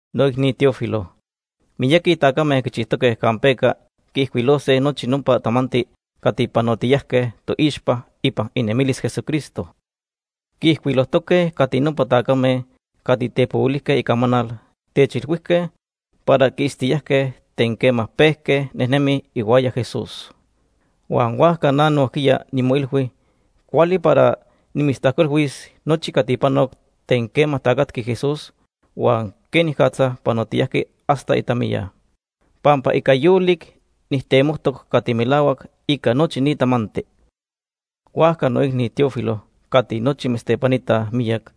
Noicni Teófilo, miyaqui tacame quichijtoque campeca quiijcuilose nochi nopa tamanti cati panotiyajque toixpa ipan inemilis Jesucristo. Quiijcuilojtoque cati nopa tacame cati tepohuilijque icamanal techilhuijque para quiitztiyajque ten quema pejque nejnemij ihuaya Jesús. Huan huajca na nojquiya nimoilhui cuali para nimitztajcuilhuis nochi cati panoc ten quema tacatqui Jesús huan quenicatza panotiyajqui hasta itamiya, pampa ica yolic nijtemojtoc cati melahuac ica nochi ni tamanti. Huajca noicni Teófilo cati nochi mitztepanitaj miyac,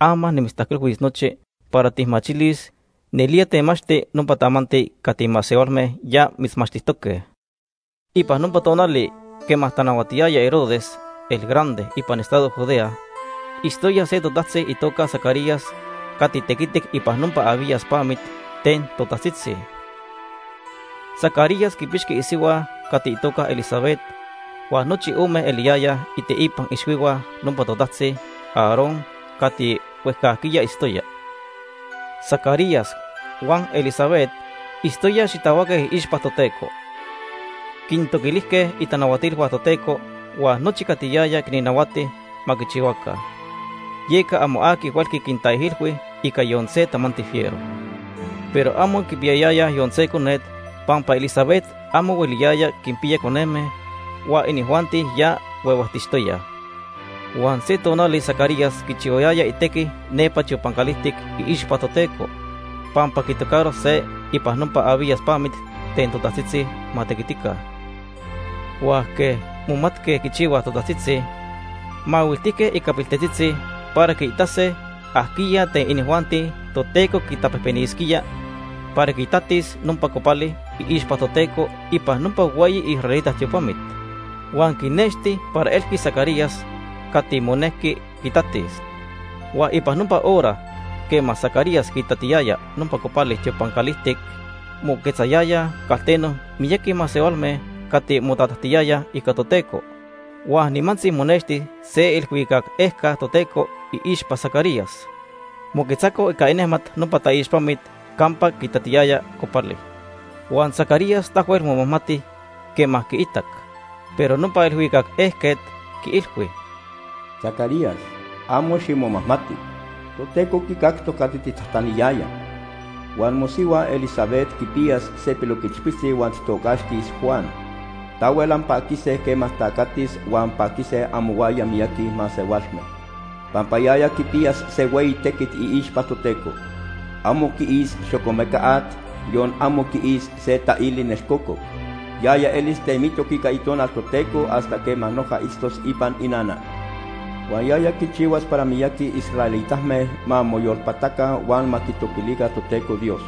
ama nimitztajcuilhuis nochi para tijmachilis nelía temachti nopa tamanti cati masehualme ya mitzmachtijtoque. Ipan nopa tonali quema tanahuatiyaya Herodes el Grande ipan estado Judea, itztoya se totajtzi itoca Zacarías cati tequitic ipan nopa Abías pamit ten totajtzitzi. Zacarías quipixqui isihua cati itoca Elisabet huan nochi ome eliyayaj iteipan ixhuihua nopa totajtzi Aarón cati huejcajquiya itztoya. Zacarías huan Elisabet itztoyaj xitahuaque iixpa Toteco. Quintoquilijque itanahuatilhua Toteco huan nochi cati yaya quinnahuati ma quichihuaca. Yeca amo aqui huelqui quintaijilhui ica yon se tamanti fiero. Pero amo quipiyayayaj yon se conet pampa Elisabet amo hueliyaya quinpiya coneme, huan inijuanti ya huehuejtixtoyaj. Huan se tonali Zacarías quichihuayaya itequi nepa tiopan calijtic iixpa Toteco, pampa quitocaro se ipan nopa Abías pamit ten totajtzitzi ma tequitica. Huan quej momatque quichihuaj totajtzitzi, mahuiltijque ica piltetzitzi para quiitase ajquiya ten inijuanti Toteco quitapejpenisquía para quitatis nopa copali iixpa Toteco ipan nopa hueyi israelita tiopamit. Huan quinexti para elqui Zacarías cati monequi quitatis. Huan ipan nopa hora quema Zacarías quitatiyaya nopa copali tiopan calijtic, moquetzayayaj calteno miyaqui masehualme cati motatajtiyayaj ica Toteco. Huan nimantzi monexti se iilhuicac ejca Toteco iixpa Zacarías. Moquetzaco ica inejmat nopa taixpamit campa quitatiyaya copali. Huan Zacarías tahuel momajmati quema quiitac. Pero nopa ilhuicac ejquet quiilhui: ―Zacarías, amo ximomajmati. Toteco quicactoc cati tijtajtaniyaya, huan mosihua Elisabet quipiyas se piloquichpiltzi huan tijtocaxtis Juan. Tahuel anpaquise quema tacatis huan paquise amohuaya miyaqui masehualme, pampa yaya quipiyas se hueyi tequit iixpa Toteco. Amo quiis xocomeca at, yon amo quiis se taili nelcococ. Yaya elis temitoc ica Itonal Toteco hasta quema noja itztos ipan inana. Huan yaya quichihuas para miyaqui israelitame ma moyolpataca huan ma quitoquilica Toteco Dios.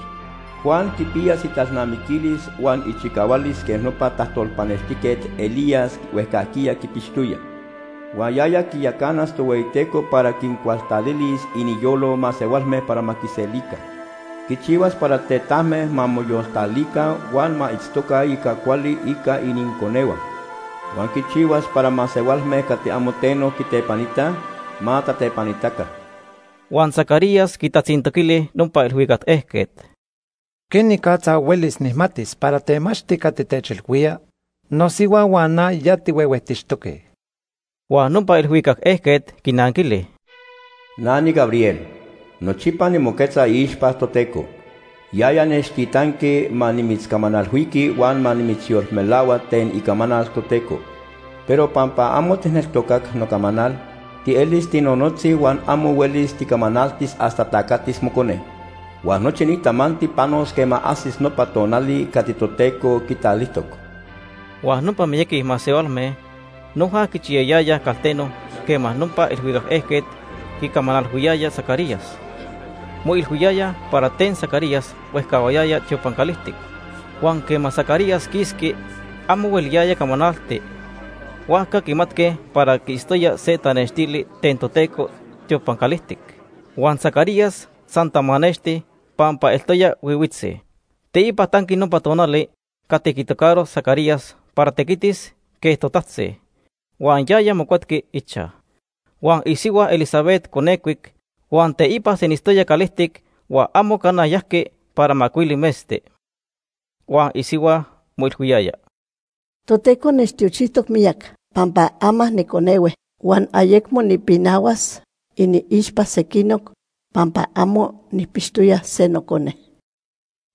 Juan quipiyas italnamiquilis huan ichicahualis quej nopa tajtolpanextijquet Elías huejcajquiya quipixtoya. Huan yaya quiyacanas Tohueyiteco para quincualtalilis iniyolo masehualme para ma quiselica. Quichihuas para tetajme ma moyoltalica huan ma itztoca ica cuali ica ininconehua. Huan quichihuas para masehualme cati amo teno quitepanitaj, ma tatepanitaca. Huan Zacarías quitatzintoquili nopa ilhuicac ejquet: ―¿Quenicatza huelis nijmatis para temachti cati techilhuía? Nosihua huan na ya tihuehuejtixtoque. Huan nopa ilhuicac ejquet quinanquili: ―Na niGabriel. Nochipa nimoquetza iixpa Toteco. Yaya nechtitanqui ma nimitzcamanalhuiqui huan ma nimitzyolmelahua ten icamanal Toteco. Pero pampa amo tijneltocac nocamanal, tielis tinonotzi huan amo huelis ticamanaltis hasta tacatis mocone. Huan nochi ni tamanti panos quema ajsis nopa tonali cati Toteco quitalijtoc. Huan nopa miyaqui masehualme noja quichiyayayaj calteno quema nopa ilhuicac ejquet quicamanalhuiyaya Zacarías. Moilhuiyayaj para ten Zacarías huejcahuayaya tiopan calijtic. Huan quema Zacarías quisqui, amo hueliyaya camanalti. Huajca quimatque para quiitztoya se tanextili ten Toteco tiopan calijtic. Huan Zacarías san tamanexti, pampa eltoya nonotzi. Teipa tanqui nopa tonali cati quitocaro Zacarías para tequitis quej totajtzi, huan yaya mocuetqui ichaj. Huan isihua Elisabet conecuic, huan teipa senitztoya calijtic huan amo cana yajqui para macuili metzti. Huan isihua moilhuiyaya: “Toteco nechtiochijtoc miyac, pampa ama niconehue huan ayecmo nipinahuas iniixpa sequinoc pampa amo nijpixtoya se nocone.”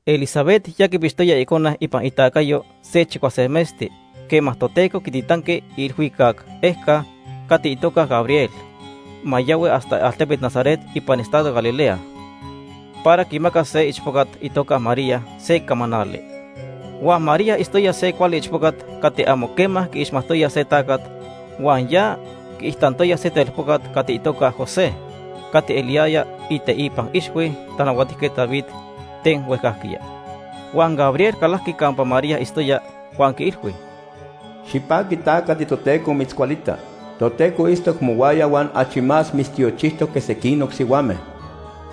Elisabet ya quipixtoya icone ipan itacayo se chicuase metzti quema Toteco quititanqui iilhuicac ejca cati itoca Gabriel ma yahui hasta altepet Nazaret ipan estado Galilea para quimacas se ichpocat itoca María se camanali. Huan María itztoya se cuali ichpocat cati amo quema quiixmajtoya se tacat huan ya quiijtantoya se telpocat cati itoca José cati eliyaya iteipan ixhui Tanahuatijquet David ten huejcajquiya. Huan Gabriel calajqui campa María itztoya huan quiilhui: ―Xipaqui ta cati Toteco mitzcualita. Toteco itztoc mohuaya huan achi más mitztiochijtoc que sequinoc sihuame.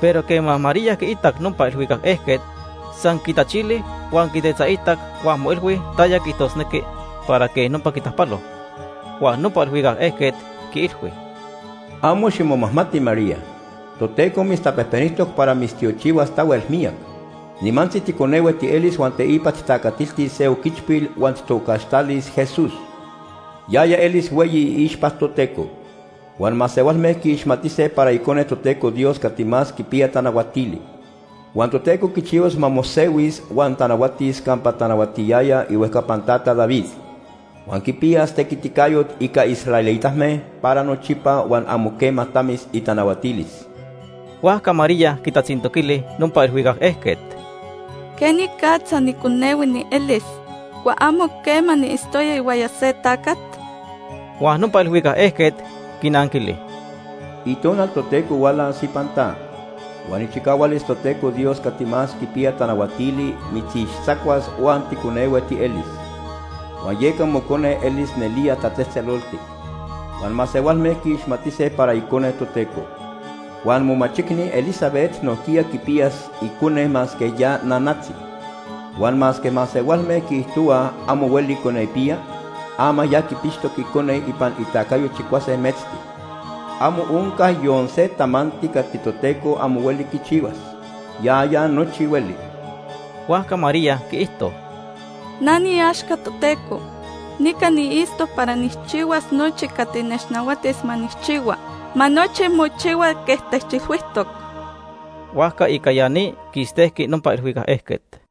Pero quema María quiitac nopa ilhuicac ejquet, san quitachili huan quitetzaitac huan moilhui taya quiijtosnequi para quej nopa quitajpalo. Huan nopa ilhuicac ejquet quiilhui: ―Amo ximomajmati María. Toteco mitztapejpenijtoc para mitztiochihuas tahuel miyac. Nimantzi ticonehue tielis huan teipa tijtacatiltis se oquichpil huan tijtocaxtalis Jesús. Yaya elis hueyi iixpa Toteco. Huan masehualme quiixmatise para Icone Toteco Dios Cati Más Quipiya Tanahuatili. Huan Toteco quichihuas ma mosehuis huan tanahuatis campa tanahuatiyaya ihuejcapan tata David. Huan quipiyas tequiticayot ica israelitame para nochipa huan amo quema tamis itanahuatilis. Huajca María quitatzintoquili nopa ilhuicac ejquet: ―¿Quenicatza niconehue nielis, huan amo quema niitztoya ihuaya se tacat? Huan nopa ilhuicac ejquet quinanquili: ―Itonal Toteco hualas ipan ta, huan ichicahualis Toteco Dios Cati Más Quipiya Tanahuatili mitzixtzacuas huan ticonehue tielis. Huan yeca mocone elis nelía tatzejtzeloltic, huan masehualme quiixmatise para Icone Toteco. Huan momachicni Elisabet nojquiya quipiyas icone masque ya nanatzi. Huan masque masehualme quiijtohuaj amo hueli conepiya, ama ya quipixtoc icone ipan itacayo chicuase metzti. Amo onca yon se tamanti cati Toteco amo hueli quichihuas. Yaya nochi hueli. Huajca María quiijto: ―Na niiaxca Toteco. Nica niitztoc para nijchihuas nochi cati nechnahuatis ma nijchihua. Ma nochi mochihua quej techilhuijtoc. Huajca ica ya ni, quistejqui nopa ilhuicac ejquet.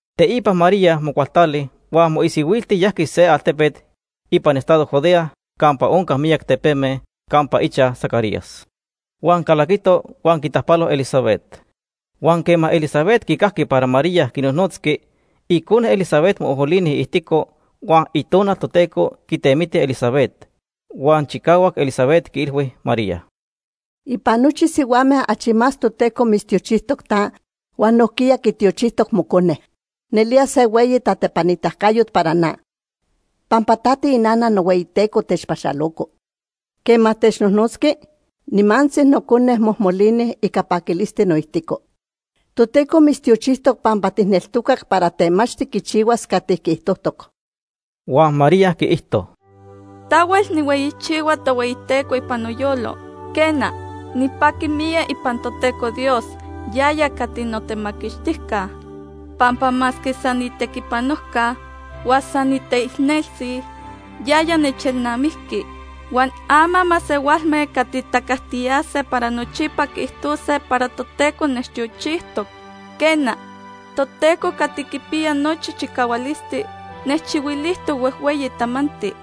Teipa María mocualtali huan moisihuilti yajqui se altepet ipan estado Judea campa onca miyac tepeme, campa ichaj Zacarías. Huan calaquito huan quitajpalo Elisabet. Huan quema Elisabet quicajqui para María quinojnotzqui, icone Elisabet mojmolini iijtico. Huan Itonal Toteco quitemiti Elisabet, huan chicahuac Elisabet quiilhui María: ―Ipan nochi sihuame achi más Toteco mitztiochijtoc ta, huan nojquiya quitiochijtoc mocone. Nelía se hueyi tatepanitacayot para na, pampa ta tiinana nohueyiTeco techpaxaloco. Quema technojnotzqui, nimantzi nocone mojmolini ica paquilisti noijtico. Toteco mitztiochijtoc pampa tijneltocac para temachti quichihuas cati quiijtojtoc. Huan María quiijto: “Tahuel nijhueyichihua Tohueyiteco ipan noyolo. Quena, nipaqui miyac ipan Toteco Dios, yaya cati notemaquixtijca. Pampa masque san niitequipanojca, huan san niteicneltzi, yaya nechelnamijqui, huan ama masehualme cati tacajtiyase para nochipa quiijtose para Toteco nechtiochijtoc. Quena, Toteco Cati Quipiya Nochi Chicahualisti nechchihuilijtoc huejhueyi tamanti.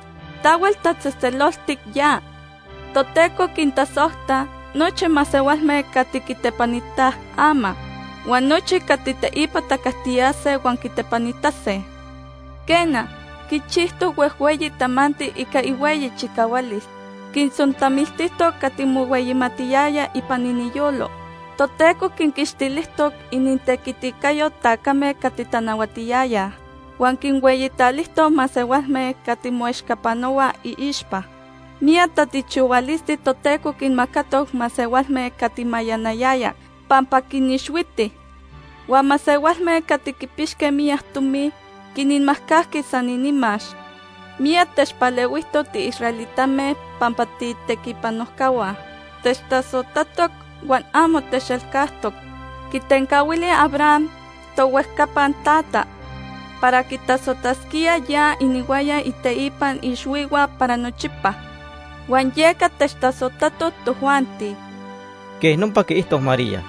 Tahuel tatzejtzeloltic ya. Toteco quintasojta nochi masehualme cati quitepanitaj ama, huan nochi cati teipa tacajtiyase huan quitepanitase. Quena, quichijtoc huejhueyi tamanti ica ihueyi chicahualis. Quintzontamiltijtoc cati mohueyimatiyayaj ipan iniyolo. Toteco quinquixtilijtoc inintequiticayo tacame cati tanahuatiyayaj, huan quinhueyitalijtoc masehualme cati moechcapanohuaj iixpa. Miyac tatiochihualisti Toteco quinmacatoc masehualme cati mayanayayaj, pampa quinixhuiti. Huan masehualme cati quipixque miyac tomi quinmajcajqui san inimax. Miyac techpalehuijtoc tiisraelitame pampa tiitequipanojcahua. Techtasojtatoc huan amo techelcajtoc. Quitencahuili Abraham, tohuejcapan tata, para quitasojtasquía ya inihuaya iteipan ixhuihua para nochipa, huan yeca techtasojtatoc tojuanti.” Quej nopa quiijto María.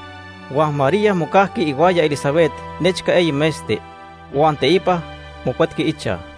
Huan María mocajqui ihuaya Elisabet nechca eyi metzti, huan teipa mocuetqui ichaj.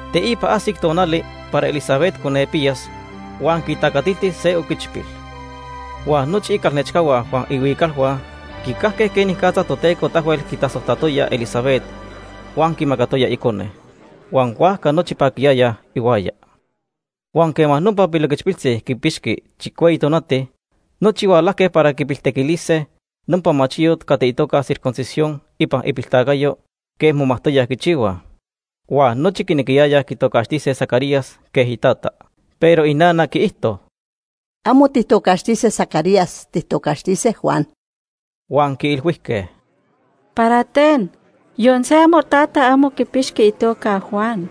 Teipa ajsic tonali para Elisabet conepiyas, huan quitacatilti se oquichpil. Huan nochi icalnechcahua huan ihuicalhua quicajque quenicatza Toteco tahuel quitasojtatoya Elisabet huan quimacatoya icone, huan huajca nochi paquiyayaj ihuaya. Huan quema nopa piloquichpiltzi quipixqui chicueyi tonati, nochi hualajque para quipiltequilise nopa machiyot cati itoca circuncisión ipan ipiltacayo quej momajtoyaj quichihuaj. Huan nochi quinequiyayaj quitocaxtise Zacarías quej itata. Pero inana quiijto: ―Amo tijtocaxtise Zacarías, tijtocaxtise Juan. Huan quiilhuijque: ―¿Para ten? Yon se amotata amo quipixqui itoca Juan.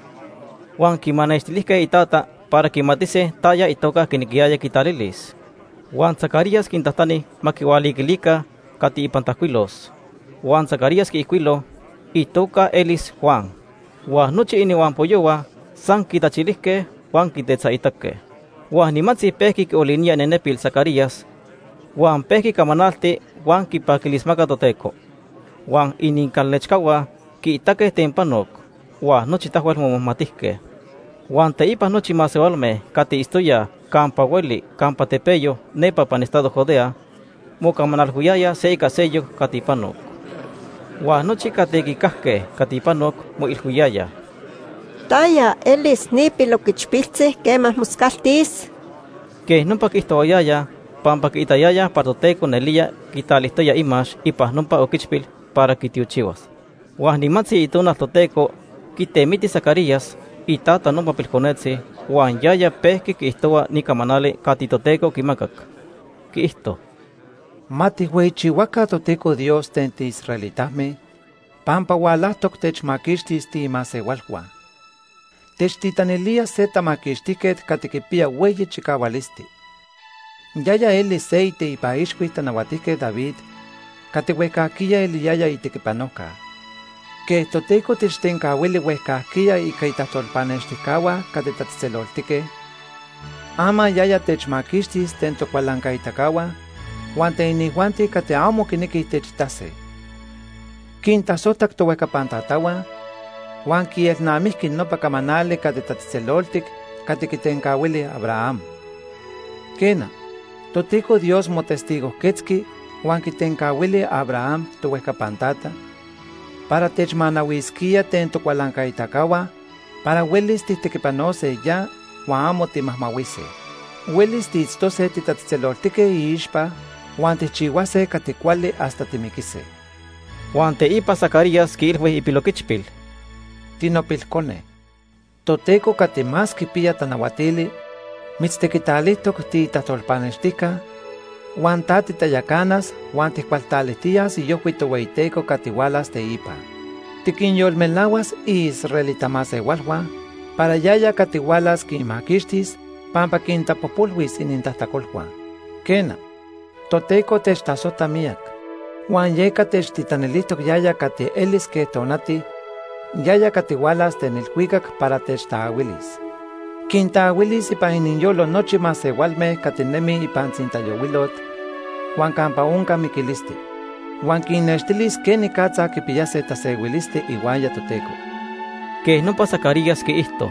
Huan quimanextilijque itata para quimatise taya itoca quinequiyaya quitalilis. Huan Zacarías quintajtani ma quihualiquilica cati ipan tajcuilos. Huan Zacarías quiijcuilo: “Itoca elis Juan.” Huan nochi inihuampoyohua san quitachilijque huan quitetzaitaque. Huan nimantzi pejqui quiolinía inenepil Zacarías, huan pejqui camanalti huan quipaquilismaca Toteco. Huan inincalnechcahua quiitaque ten panoc, huan nochi tahuel momajmatijque. Huan teipa nochi masehualme cati itztoyaj campa hueli campa tepeyo nepa ipan estado Judea mocamanalhuiyayaj se ica seyoc cati panoc. Huan nochi cati quicajque cati panoc moilhuiyayaj: “¿Taya elis ni piloquichpiltzi quema moscaltis?” Quej nopa quiijtohuayayaj pampa quiitayayaj para Toteco nelía quitalijtoya imax ipan nopa oquichpil para quitiochihuas. Huan nimantzi Itonal Toteco quitemiti Zacarías, itata nopa pilconetzi, huan yaya pejqui quiijtohua ni camanali cati Toteco quimacac. Quiijto: “Ma tijhueyichihuaca Toteco Dios ten tiisraelitame, pampa hualajtoc techmaquixtis tiimasehualhua. Techtitanilía se Temaquixtijquet cati quipiya hueyi chicahualisti. Yaya elis se iteipan ixhui Tanahuatijquet David cati huejcajquiya eliyaya itequipanojca. Quej Toteco techtencahuili huejcajquiya ica itajtolpanextijcahua cati tatzejtzeloltique, ama yaya techmaquixtis ten tocualancaitacahua huan ten inijuanti cati amo quinequij techitase. Quintasojtac tohuejcapan tatahua, huan quielnamijqui nopa camanali tatzejtzeloltic cati quitencahuili Abraham. Quena, Toteco Dios motestigojquetzqui huan quitencahuili Abraham, tohuejcapan tata, para techmanahuisquía ten tocualancaitacahua para huelis tijtequipanose ya huan amo timajmahuise. Huelis tiitztose titatzejtzeloltique iixpa huan tijchihuase cati cuali hasta timiquise.” Huan teipa Zacarías quiilhui ipiloquichpil: “Tinopilcone, Toteco Cati Más Quipiya Tanahuatili mitztequitalijtoc tiitajtolpanextijca, huan ta titayacanas huan tijcualtalijtiyas iojhui Tohueyiteco cati hualas teipa. Tiquinyolmelahuas iisraelita masehualhua para yaya cati hualas quinmaquixtis, pampa quintapojpolhuis inintajtacolhua. Quena, Toteco techtasojta miyac, huan yeca techtitanilijtoc yaya cati elis quej tonati, yaya cati hualas ten ilhuicac para techtaahuilis. Quintaahuilis ipan iniyolo nochi masehualme cati nemij ipan tzintayohuilot huan campa onca miquilisti. Huan quinnextilis quenicatza quipiyase tasehuilisti ihuaya Toteco.” Quej nopa Zacarías quiijto.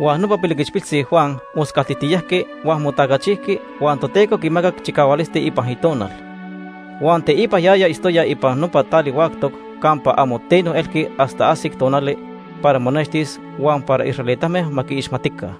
Huan nopa piloquichpiltzi Juan moscaltijtiyajqui huan motacachijqui huan Toteco quimacac chicahualisti ipan itonal. Huan teipa yaya itztoya ipan nopa tali huactoc campa amo teno elqui hasta ajsic tonali para monextis huan para israelitame ma quiixmatica.